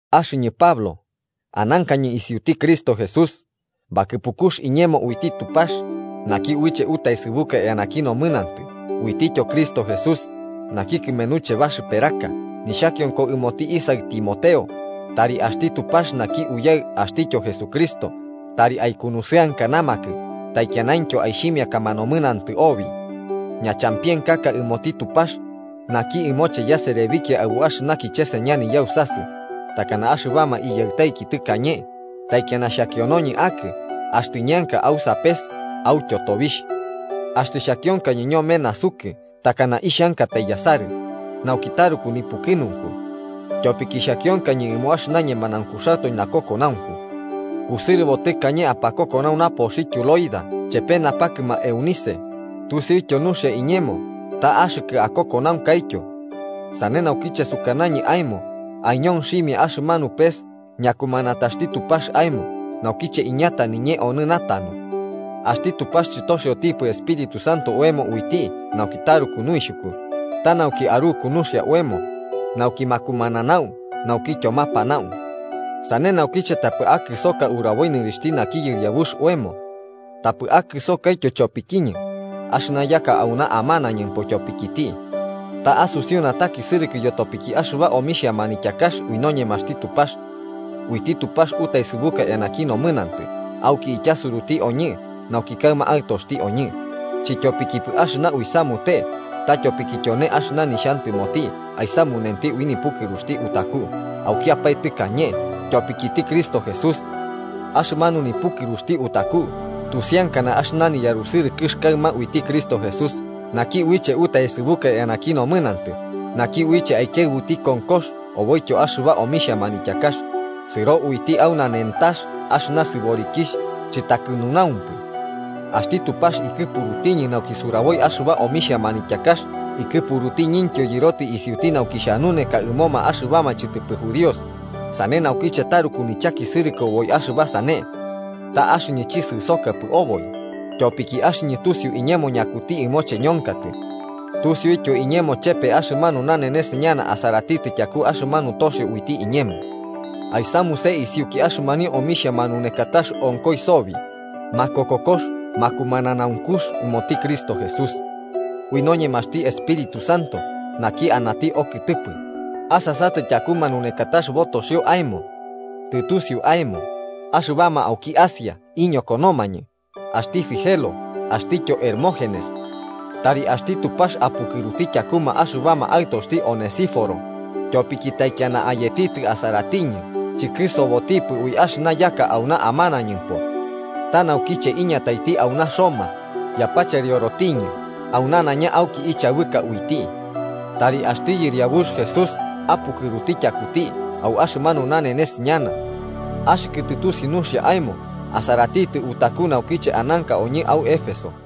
Axɨñɨ Pablo, anankañɨ isiuti Cristo Jesús, bakɨpukux iñemo uiti Tupax, naki uiche utaesɨbuka eanaki nomɨnantɨ uitityo Cristo Jesús, naki kɨmenuche baxɨperaka, nixhakionko ɨmoti isaɨ Timoteo, tari axti Tupax naki Uyaɨ axtityo Jesucristo, tari aikunusɨankanamakɨ taikianaintyo aixhimiakama nomɨnantɨ obi. Ñachampienkaka ɨmoti Tupax, naki ɨmoche yaserebikia aɨbu axɨna kicheseña niyausasɨ, takana axɨbama iyaɨtaiki tɨkañe, taikiana xhakionoñɨ akɨ axtɨ ñeanka au sapes autyo tobixh. Axtɨ xhakionkañɨ ñome nasukɨ, takana ixhankatai yasarɨ, nauki taruku nipukɨnunku. Tyopiki xhakionkañɨ ɨmo axɨna ñemanaunkuxatoe nakokonaunku. Kusɨrɨbo tɨkañe apakokonau napoxityo Loida chepe napakɨma Eunice, tusiuityo nuxia iñemo ta axɨkɨ akokonaunkaityo. Sane naukiche sukanañɨ aemo aiñonximia axɨmanu pes ñakumanataxti Tupax aemo naukiche iñata niñee onɨ natanu. Axti Tupax chɨtoxiotipɨ Espíritu Santo oemo uiti nauki taruku nuixhuku, ta nauki aruku nuxia oemo, nauki makumananau naukityo mapanau. Sane naukiche, tapɨ akɨsoka uraboi nɨrixhti naki Yɨriabux oemo. Tapɨ akɨsokaityo chopikiñɨ, axɨna yaka auna amanañɨmpo tyopikiti. Ta asusiu natakisɨrɨkɨ yotopiki axɨba omixhia manityakax ui noñemaxti Tupax. Uiti Tupax utaesɨbuka eanaki nomɨnantɨ auki ityasuruti oñɨ nauki kaɨma aɨtoxti oñɨ, chɨtyopikipɨ axɨna uisamute, ta tyopiki tyone axɨna nixhantɨmoti aisamunenti ui nipukɨruxti utaku aukiapae tɨkañe, tyopikiti Cristo Jesús. Axɨmanu nipukɨruxti utaku tusiankana axɨna niyarusɨrɨkɨx kaɨma uiti Cristo Jesús naki uiche utaesɨbuka eanaki nomɨnantɨ, naki uiche aikiaɨbuti konkox oboityo axɨba omixhia manityakax, sɨro uiti au nanentax axɨna sɨborikixh chɨtakɨnunaumpɨ. Axti Tupax ikɨpurutiñɨ nauki suraboi axɨba omixhia manityakax ikɨpurutiñɨntyo yɨrotɨ isiuti nauki xhanuneka ɨmoma axɨbama chɨtɨpɨ judíos, sane naukiche taruku nichakisɨrɨkɨ oboi axɨba sane. Ta axɨñɨ chisɨsokapɨ oboi, tyopiki axɨñɨ tusiu iñemo ñakuti ɨmoche ñonkatɨ. Tusiuityo iñemo chepe axɨmanu nanenes ñana asaratitɨ tyaku axɨmanu toxio uiti iñemo. Aisamuse isiuki axɨmanio omixhia manunekatax onkoi sobi, makokokox makumananaunkux ɨmoti Cristo Jesús. Ui noñemaxti Espíritu Santo naki anati okɨtɨpɨ, asasatɨ tyaku manunekatax botoxio aemo. Tɨtusiu aemo, axɨbama auki Asia iñokonomañɨ, axti Figelo axtityo Hermógenes. Tari axti Tupax apukɨruti tyakuma axɨbama aɨtoxti Onesíforo, tyopiki taikiana ayetitɨ asaratiñɨ chikɨsobotipɨ ui axɨna yaka auna amanañɨmpo. Ta naukiche iñataiti auna au Roma, yapacheriorotiñɨ au nanaiña auki ichabɨka uiti. Tari axti Yɨriabux Jesús apukɨruti tyakuti au axɨmanu nanenes ñana. Axɨkɨ tɨtusiu nuxia aemo asaratitɨ utaku naukiche ananka oñɨ au Éfeso.